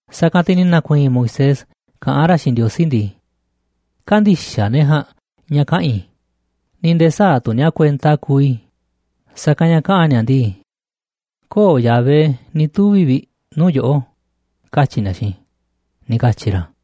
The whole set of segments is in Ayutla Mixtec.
Sa̱kanꞌ te̱ ni̱ na̱ku̱i̱i̱n Moisés kaꞌán ra̱ xiinꞌ Ndiosí ndii: ―Kä̱ndi̱xaꞌ ne̱ ja̱a̱nꞌ ña̱ kaꞌa̱n i̱, ni̱ nde̱e̱ sä̱a̱ tu̱ ni̱a̱ kuenta kuuꞌ i̱, sa̱kanꞌ ña̱ kaꞌa̱n ni̱a̱ ndii: “Köo̱ꞌ Yahvé ni̱ tuvi̱ vi̱ꞌ nuu̱ꞌ yoꞌó”, katyi̱ ni̱a̱ xiinꞌ i̱ ―ni̱ katyi̱ ra̱.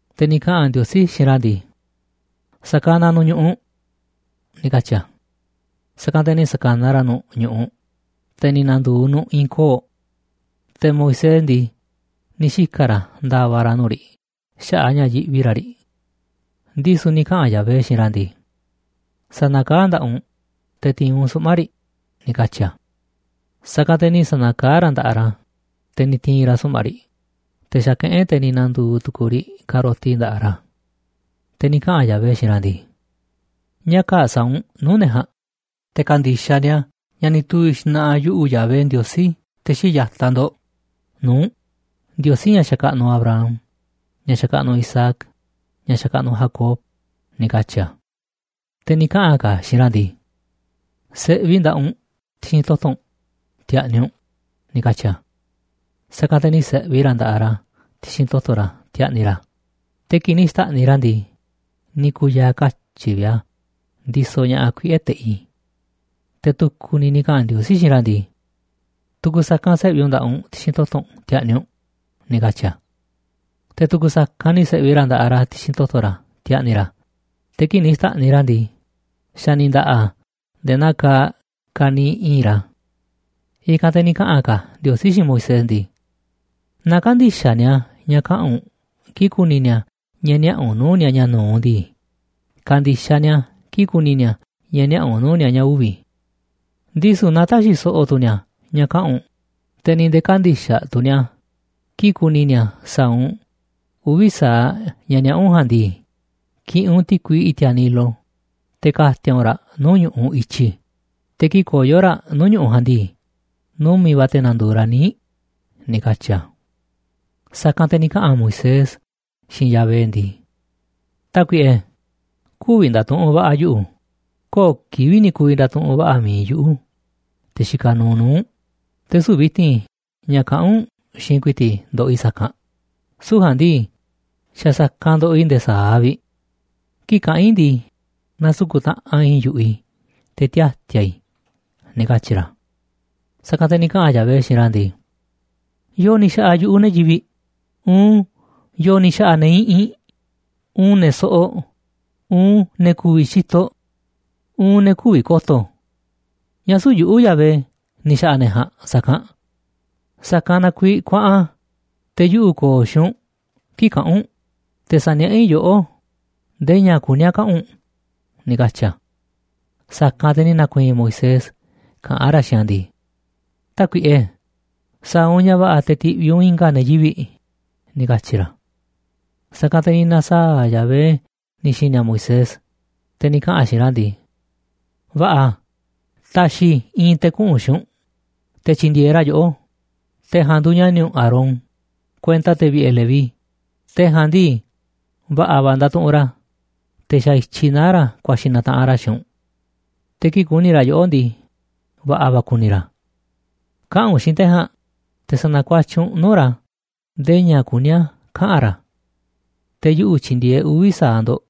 Te̱ ni̱ kaꞌa̱n Ndiosí xiinꞌ ra̱ ndii: ―Sa̱kanaꞌ nu̱ꞌ ñu̱ꞌuꞌ ―ni̱ katyi̱ a̱. Sa̱kanꞌ te̱ ni̱ sa̱kanaꞌ ra̱ nu̱ꞌ ñu̱ꞌuꞌ, te̱ ni̱ na̱ndu̱u̱ nu̱ꞌ i̱i̱n koo̱ꞌ. Te̱ Moisés ndii, ni̱ xika̱ ra̱ nda̱va̱ ra̱ nuu̱ꞌ riꞌ xaꞌa̱ꞌ a̱ ña̱ yiꞌvi ra̱ riꞌ. Ndisu̱ ni̱ kaꞌa̱n Yahvé xiinꞌ ra̱ ndii: ―Sa̱na̱kaá nda̱ꞌaꞌ u̱nꞌ te̱ ti̱i̱n u̱nꞌ suꞌma̱ꞌ riꞌ ―ni̱ katyi̱ a̱. Sa̱kanꞌ te̱ ni̱ sa̱na̱kaá ra̱ nda̱ꞌaꞌ ra̱, te̱ ni̱ ti̱i̱n ra̱ suꞌma̱ꞌ riꞌ, te̱ xa̱kaꞌán e̱ꞌ te̱ ni̱ na̱ndu̱u̱ tu̱ku̱u̱ riꞌ ka̱roti nda̱ꞌaꞌ ra̱. Te̱ ni̱ kaꞌa̱n Yahvé xiinꞌ ra̱ ndii: ―Ña̱ kaa̱ꞌ sa̱a̱ u̱nꞌ nuu̱ꞌ ne̱ ja̱a̱nꞌ te̱ ka̱ndi̱xaꞌ ni̱a̱ ña̱ ni̱ tuvi̱ xna̱ꞌa̱ yuꞌu̱, Yahvé, Ndiosí te̱ xii̱ꞌ ya̱taꞌ ndo̱ꞌ, nuu̱ꞌ u̱nꞌ, Ndiosí ña̱ xakaꞌnuꞌ Abraham, ña̱ xakaꞌnuꞌ Isaac, ña̱ xakaꞌnuꞌ Jacob ―ni̱ katyi̱ a̱. Te̱ ni̱ kaꞌa̱n ka̱ a̱ xiinꞌ ra̱ ndii: ―Se̱ꞌvi nda̱ꞌaꞌ u̱nꞌ ti̱xi̱n toto̱ u̱nꞌ ti̱a̱ꞌni̱ u̱nꞌ ―ni̱ katyi̱ a̱. Sa̱kanꞌ te̱ ni̱ se̱ꞌvi ra̱ nda̱ꞌaꞌ ra̱ ti̱xi̱n toto̱ ra̱ ti̱a̱ꞌni̱ ra̱, te̱ kii̱ꞌ ni̱ xta̱ꞌniꞌ ra̱ a̱ ndii, ni̱ ku̱ya̱a̱ katyi̱ vi̱ꞌ a̱ ndisoꞌ ña̱ꞌaꞌ kuiꞌe̱ teꞌi. Te̱ tu̱ku̱ ni̱ ni̱ kaꞌa̱n Ndiosí xiinꞌ ra̱ ndii: ―Tu̱ku̱ sa̱kanꞌ se̱ꞌvi u̱nꞌ nda̱ꞌaꞌ u̱nꞌ ti̱xi̱n toto̱ u̱nꞌ ti̱a̱ꞌni̱ u̱nꞌ ―ni̱ katyi̱ a̱. Te̱ tu̱ku̱ sa̱kanꞌ ni̱ se̱ꞌvi ra̱ nda̱ꞌaꞌ ra̱ ti̱xi̱n toto̱ ra̱ ti̱a̱ꞌni̱ ra̱, te̱ kii̱ꞌ ni̱ xta̱ꞌniꞌ ra̱ a̱ ndii, xa̱ ni̱ nda̱ꞌa̱ a̱ nde̱e̱ naa kaaꞌ ka̱niiꞌ i̱i̱nꞌ ra̱. I̱kanꞌ te̱ ni̱ kaꞌa̱n ka̱ Ndiosí xiinꞌ Moisés ndii: ―Naaꞌ kä̱ndi̱xaꞌ ni̱a̱ ña̱ kaꞌa̱n u̱nꞌ kii̱ꞌ ku̱ni̱ ni̱a̱ ña̱ niaꞌa̱ u̱nꞌ nuu̱ꞌ ni̱a̱ ña̱ nu̱uꞌ ndii, ka̱ndi̱xaꞌ ni̱a̱ kii̱ꞌ ku̱ni̱ ni̱a̱ ña̱ niaꞌa̱ u̱nꞌ nuu̱ꞌ ni̱a̱ ña̱ uvi̱. Ndisu̱ naaꞌ tä̱xi̱ so̱ꞌo̱ tu̱ ni̱a̱ ña̱ kaꞌa̱n u̱nꞌ, te̱ ni̱ nde̱e̱ kä̱ndi̱xaꞌ tu̱ ni̱a̱ kii̱ꞌ ku̱ni̱ ni̱a̱ sa̱a̱ u̱nꞌ uvi̱ sa̱aꞌ ña̱ niaꞌa̱ u̱nꞌ ja̱a̱nꞌ ndii, ki̱ꞌi̱n u̱nꞌ ti̱kui i̱ti̱a̱ Nilo, te̱ ka̱ti̱a̱ u̱nꞌ raꞌ nuu̱ꞌ ñu̱ꞌuꞌ i̱tyi, te̱ kii̱ꞌ koyo̱ raꞌ nuu̱ꞌ ñu̱ꞌuꞌ ja̱a̱nꞌ ndii, numi̱ꞌ va̱ te̱ na̱ndu̱u̱ raꞌ níiꞌ ―ni̱ katyi̱ a̱. Sa̱kanꞌ te̱ ni̱ kaꞌa̱n Moisés xiinꞌ Yahvé ndii: ―Tákuiꞌe, kü̱vi̱ nda̱tuꞌunꞌ va̱ꞌa̱ yuꞌu̱, köo̱ꞌ kivi̱ꞌ ni̱ ku̱vi̱ nda̱tuꞌunꞌ va̱ꞌa̱ mi̱iꞌ yuꞌu̱, te̱ xikaꞌ nuuꞌ nuu̱ꞌ u̱nꞌ, te̱ süu̱ꞌ vi̱ti̱n ña̱ kaꞌán u̱nꞌ xiinꞌ ku̱i̱ti̱ꞌ i̱ ndoꞌoꞌ i̱ sa̱kanꞌ, süu̱ꞌ ja̱a̱nꞌ ndii, xa̱ sa̱kanꞌ ndoꞌoꞌ i̱ nde̱e̱ sa̱aꞌ vi̱ꞌ. Kii̱ꞌ kaꞌán i̱ ndii, nasuku̱ꞌ taꞌanꞌ i̱i̱n yu̱ꞌuꞌ i̱, te̱ tiati̱a̱ i̱ ―ni̱ katyi̱ ra̱. Sa̱kanꞌ te̱ ni̱ kaꞌa̱n Yahvé xiinꞌ ra̱ ndii: ―¿Yo̱o̱ ni̱ xa̱ꞌa̱ yu̱ꞌuꞌ ne̱ yivi̱ꞌ? Uun, ¿yo̱o̱ ni̱ xa̱ꞌa̱ ne̱ iꞌinꞌ, uun ne̱ soꞌoꞌ, uun ne̱ ku̱vi̱ xitoꞌ, uun ne̱ kü̱vi̱ ko̱to̱? ¿Ñáá süu̱ꞌ yuꞌu̱, Yahvé, ni̱ xa̱ꞌa̱ ne̱ ja̱a̱nꞌ sa̱kanꞌ? Sa̱kanꞌ na kuiiꞌ kuaꞌan, te̱ yuꞌu̱ ko̱o̱ xiinꞌ u̱nꞌ kii̱ꞌ kaꞌa̱n u̱nꞌ, te̱ sa̱niaꞌá i̱ yoꞌó ndee ña̱ kuní a̱ kaꞌa̱n u̱nꞌ ―ni̱ katyi̱ a̱. Sa̱kanꞌ te̱ ni̱ na̱ku̱i̱i̱n Moisés kaꞌán ra̱ xiinꞌ a̱ ndii: ―Tákuiꞌe, sa̱a̱ u̱nꞌ ña̱ va̱ꞌa̱ te̱ ti̱ꞌviꞌ u̱nꞌ i̱nga̱ ne̱ yivi̱ꞌ ―ni̱ katyi̱ ra̱. Sa̱kanꞌ te̱ ni̱ na̱saa̱ꞌ Yahvé ni̱ xi̱ni̱ a̱ Moisés, te̱ ni̱ kaꞌa̱n a̱ xiinꞌ ra̱ ndii: ―Va̱ꞌa̱, ta̱xi̱ i̱ i̱i̱n te̱ kuꞌu̱n xiinꞌ u̱nꞌ te̱ tyi̱ndi̱e̱eꞌ ra̱ yoꞌó, te̱ ja̱a̱nꞌ nduuꞌ ña̱ni̱ u̱nꞌ Aarón, kuenta te̱ vi̱ꞌe̱ Leví. Te̱ ja̱a̱nꞌ ndii, va̱ꞌa̱ va̱ ndatuꞌunꞌ ra̱, te̱ xa̱ i̱tyiꞌ naá ra̱ ku̱a̱xi̱ na̱taꞌanꞌ ra̱ xiinꞌ u̱nꞌ. Te̱ kii̱ꞌ ku̱ni̱ ra̱ yoꞌó ndii, va̱ꞌa̱ va̱ ku̱ni̱ ra̱. Kaꞌa̱n u̱nꞌ xiinꞌ te̱ ja̱a̱nꞌ, te̱ sa̱na̱kuatyiꞌ u̱nꞌ nuu̱ꞌ ra̱ ndee ña̱ kuní a̱ kaꞌa̱n ra̱. Te̱ yuꞌu̱ tyi̱ndi̱e̱eꞌ uvi̱ sa̱aꞌ ndo̱ꞌ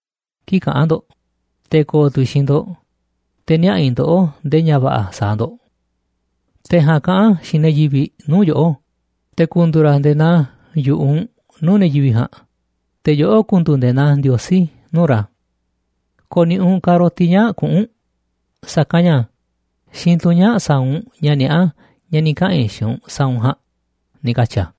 kii̱ꞌ kaꞌa̱n ndo̱ꞌ, te̱ ko̱o̱ tu̱ i̱ xiinꞌ ndo̱ꞌ, te̱ niaꞌa̱ i̱ ndoꞌó ndee ña̱ va̱ꞌa̱ sa̱a̱ ndo̱ꞌ. Te̱ ja̱a̱nꞌ kaꞌa̱n xiinꞌ ne̱ yivi̱ꞌ nuu̱ꞌ yoꞌó, te̱ ku̱ndu̱u̱ ra̱ nde̱e̱ naa yu̱ꞌuꞌ u̱nꞌ nuu̱ꞌ ne̱ yivi̱ꞌ ja̱a̱nꞌ, te̱ yoꞌó ku̱ndu̱u̱ nde̱e̱ naa Ndiosí nuu̱ꞌ ra̱. Ko̱ni̱ꞌi̱ u̱nꞌ ka̱roti ñaa̱ꞌ kuꞌu̱n u̱nꞌ, sa̱kanꞌ ña̱ xiinꞌ tunꞌ ñaa̱ꞌ sa̱a̱ u̱nꞌ ña̱ niaꞌá ña̱ ni̱ kaꞌa̱n i̱ xiinꞌ u̱nꞌ sa̱a̱ u̱nꞌ ja̱a̱nꞌ ―ni̱ katyi̱ a̱.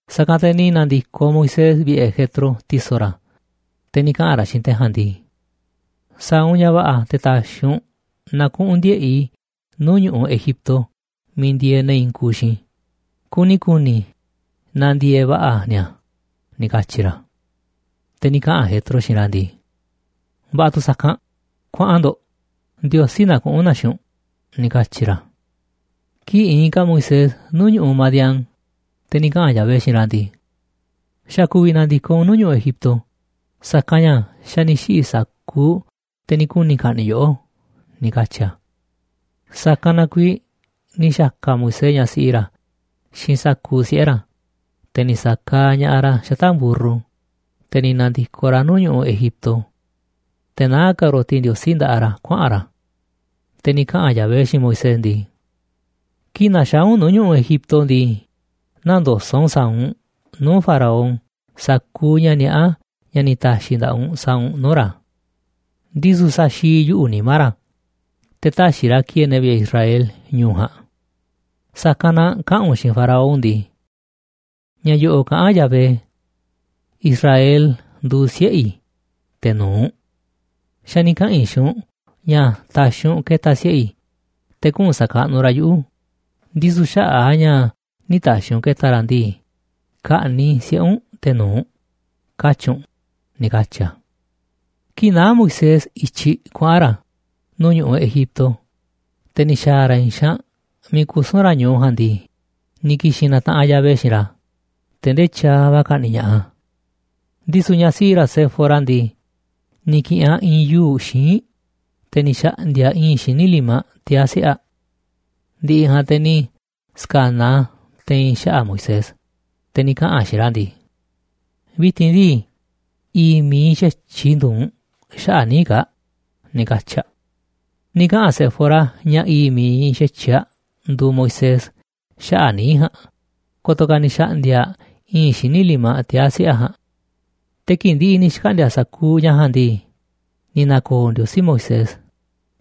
Sa̱kanꞌ te̱ ni̱ na̱ndi̱koꞌ Moisés vi̱ꞌe̱ Jetro, ti̱so̱ ra̱, te̱ ni̱ kaꞌa̱n ra̱ xiinꞌ te̱ ja̱a̱nꞌ ndii: ―Sa̱a̱ u̱nꞌ ña̱ va̱ꞌa̱ te̱ ta̱xi̱ u̱nꞌ na kuꞌu̱n ndiꞌe̱ꞌ i̱ nuu̱ꞌ ñu̱ꞌuꞌ Egipto miiꞌ ndieeꞌ ne̱ i̱i̱n kuuꞌ xiinꞌ i̱, kuni ku̱ni̱ i̱ naaꞌ ndieeꞌ va̱ꞌa̱ ni̱a̱ ―ni̱ katyi̱ ra̱. Te̱ ni̱ kaꞌa̱n Jetro xiinꞌ ra̱ ndii: ―Va̱ꞌa̱ tu̱ sa̱kanꞌ, kuaꞌan ndo̱ꞌ, Ndiosí na kuꞌu̱n na xiinꞌ u̱nꞌ ―ni̱ katyi̱ ra̱. Kii̱ꞌ iinꞌ ka̱ Moisés nuu̱ꞌ ñu̱ꞌuꞌ Madián, te̱ ni̱ kaꞌa̱n Yahvé xiinꞌ ra̱ ndii: ―Xa̱ ku̱vi̱ na̱ndi̱koꞌ u̱nꞌ nuu̱ꞌ ñu̱ꞌuꞌ Egipto, sa̱kanꞌ ña̱ xa̱ ni̱ xiꞌi̱ sa̱kuuꞌ te̱ ni̱ kuni̱ ka̱ꞌni̱ꞌ yoꞌó ―ni̱ katyi̱ a̱. Sa̱kanꞌ na kuiiꞌ ni̱ xa̱ka̱ Moisés ñaꞌ siꞌi ra̱ xiinꞌ sa̱kuuꞌ siꞌe̱ ra̱, te̱ ni̱ sa̱kaaꞌ ña̱ꞌaꞌ ra̱ xata̱ꞌ mburru, te̱ ni̱ na̱ndi̱koꞌ ra̱ nuu̱ꞌ ñu̱ꞌuꞌ Egipto. Te̱ naá ka̱roti Ndiosí nda̱ꞌaꞌ ra̱ kuaꞌa̱n ra̱. Te̱ ni̱ kaꞌa̱n Yahvé xiinꞌ Moisés ndii: ―Kii̱ꞌ na̱xaa̱ u̱nꞌ nuu̱ꞌ ñu̱ꞌuꞌ Egipto ndii, nä̱ndoso̱ꞌ u̱nꞌ sa̱a̱ u̱nꞌ nuu̱ꞌ Faraón sa̱kuuꞌ ña̱ niaꞌá ña̱ ni̱ ta̱xi̱ i̱ nda̱ꞌaꞌ u̱nꞌ sa̱a̱ u̱nꞌ nuu̱ꞌ ra̱. Ndisu̱ sa̱xi̱i̱ yuꞌu̱ nimá ra̱, te̱ tä̱xi̱ ra̱ ki̱e̱e̱ ne̱ vi̱ꞌe̱ Israel ñu̱u̱ ja̱a̱nꞌ. Sa̱kanꞌ na kaꞌa̱n u̱nꞌ xiinꞌ Faraón ndii: “Ña̱ yo̱ꞌo̱ꞌ kaꞌán Yahvé: ‘Israel nduuꞌ siꞌe̱ i̱, te̱ nu̱uꞌ. Xa̱ ni̱ kaꞌa̱n i̱ xiinꞌ u̱nꞌ ña̱ ta̱xi̱ u̱nꞌ ke̱ta̱ siꞌe̱ i̱, te̱ kuꞌu̱n sa̱kaꞌnuꞌ ra̱ yuꞌu̱, ndisu̱ xaꞌa̱ꞌ a̱ ña̱ nï̱ ta̱xi̱ u̱nꞌ ke̱ta̱ ra̱ ndii, ka̱ꞌni̱ꞌ i̱ siꞌe̱ u̱nꞌ te̱ nu̱uꞌ”’, katyi̱ u̱nꞌ ―ni̱ katyi̱ a̱. Kii̱ꞌ naá Moisés i̱tyiꞌ kuaꞌa̱n ra̱ nuu̱ꞌ ñu̱ꞌuꞌ Egipto, te̱ ni̱ xa̱a̱ ra̱ i̱i̱n xaanꞌ miiꞌ kusu̱n ra̱ ñu̱u ja̱a̱nꞌ ndii, ni̱ ki̱xi̱n na̱taꞌanꞌ Yahvé xiinꞌ ra̱, te̱ ndee tyaaꞌ va̱ ka̱ꞌni̱ꞌ ña̱ꞌaꞌ a̱. Ndisu̱ ñaꞌ siꞌi ra̱ Séfora ndii, ni̱ ki̱ꞌi̱n aꞌ i̱i̱n yuu̱ꞌ xíinꞌ, te̱ ni̱ xa̱ꞌndi̱a̱ aꞌ i̱i̱nꞌ xíniꞌ limaꞌ tiaa̱ siꞌe̱ aꞌ. Ndi̱ꞌi̱ ja̱a̱nꞌ, te̱ ni̱ sa̱kanaꞌ aꞌ a̱ te̱i̱n xaꞌa̱ꞌ Moisés, te̱ ni̱ kaꞌa̱n aꞌ xiinꞌ ra̱ ndii: “Vi̱ti̱n ndii, i̱i̱ꞌ mi̱iꞌ xa̱tyiꞌ i̱ nduuꞌ u̱nꞌ xaꞌa̱ꞌ níiꞌ kaa̱ꞌ”, ni̱ katyi̱ aꞌ. Ni̱ kaꞌa̱n Séfora ña̱ i̱i̱ꞌ mi̱iꞌ xa̱tyiꞌ aꞌ nduuꞌ Moisés xaꞌa̱ꞌ níiꞌ ja̱a̱nꞌ, ko̱to̱ ka̱ ni̱ xa̱ꞌndi̱a̱ aꞌ i̱i̱nꞌ xíniꞌ limaꞌ tiaa̱ siꞌe̱ aꞌ ja̱a̱nꞌ. Te̱ kii̱ꞌ ndi̱ꞌi̱ ni̱ xkaꞌndi̱a̱ sa̱kuuꞌ ña̱ ja̱a̱nꞌ ndii, ni̱ na̱ko̱o̱ Ndiosí Moisés,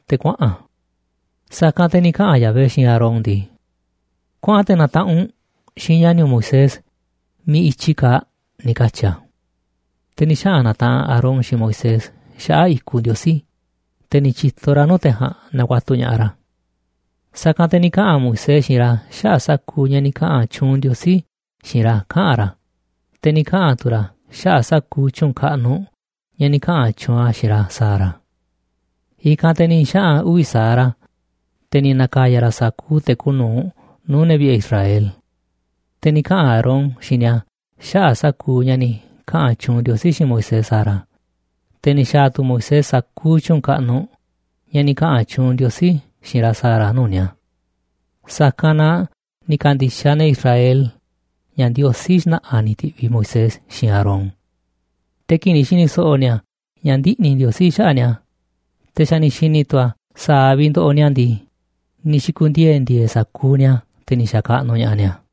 te̱ kuaꞌa̱n a̱. Sa̱kanꞌ te̱ ni̱ kaꞌa̱n Yahvé xiinꞌ Aarón ndii: ―Kuaꞌan te̱ na̱taꞌanꞌ u̱nꞌ xiinꞌ ña̱ni̱ u̱nꞌ Moisés miiꞌ i̱tyi kaaꞌ ―ni̱ katyi̱ a̱. Te̱ ni̱ xaꞌa̱n na̱taꞌanꞌ Aarón xiinꞌ Moisés xaꞌa̱ꞌ i̱kuꞌ Ndiosí, te̱ ni̱ tyi̱to ra̱ nuu̱ꞌ te̱ ja̱a̱nꞌ nakuatuꞌ ña̱ꞌaꞌ ra̱. Sa̱kanꞌ te̱ ni̱ kaꞌa̱n Moisés xiinꞌ ra̱ xaꞌa̱ꞌ sa̱kuuꞌ ña̱ ni̱ kaꞌa̱n tyuunꞌ Ndiosí xiinꞌ ra̱ kaꞌa̱n ra̱, te̱ ni̱ kaꞌa̱n tu̱ ra̱ xaꞌa̱ꞌ sa̱kuuꞌ tyu̱u̱n kaꞌnuꞌ ña̱ ni̱ kaꞌa̱n tyuunꞌ a̱ xiinꞌ ra̱ sa̱a̱ ra̱. I̱kanꞌ te̱ ni̱ xaꞌa̱n uvi̱ sa̱aꞌ ra̱, te̱ ni̱ na̱ka̱ya̱ ra̱ sa̱kuuꞌ te̱ kuuꞌ nu̱uꞌ nuu̱ꞌ ne̱ vi̱ꞌe̱ Israel. Te̱ ni̱ kaꞌa̱n Aarón xiinꞌ ni̱a̱ xaꞌa̱ꞌ sa̱kuuꞌ ña̱ ni̱ kaꞌa̱n tyuunꞌ Ndiosí xiinꞌ Moisés sa̱a̱ ra̱, te̱ ni̱ xa̱a̱ tu̱ Moisés sa̱kuuꞌ tyu̱u̱n kaꞌnuꞌ ña̱ ni̱ kaꞌa̱n tyuunꞌ Ndiosí xiinꞌ ra̱ sa̱a̱ ra̱ nuu̱ꞌ ni̱a̱. Sa̱kanꞌ na ni̱ ka̱ndi̱xaꞌ ne̱ Israel ña̱ Ndiosí xna̱ꞌa̱ ni̱ ti̱ꞌviꞌ Moisés xiinꞌ Aarón. Te̱ kii̱ꞌ ni̱ xi̱ni̱ so̱ꞌo̱ ni̱a̱ ña̱ ndiꞌni̱ Ndiosí xaꞌa̱ꞌ ni̱a̱, te̱ xa̱ ni̱ xi̱ni̱ tu̱ a̱ sa̱a̱ vi̱ꞌ ndoꞌoꞌ ni̱a̱ ndii, ni̱ xi̱ku̱ndiee̱ ndi̱e̱e̱ sa̱kuuꞌ ni̱a̱, te̱ ni̱ xa̱kaꞌnuꞌ ña̱ꞌaꞌ ni̱a̱.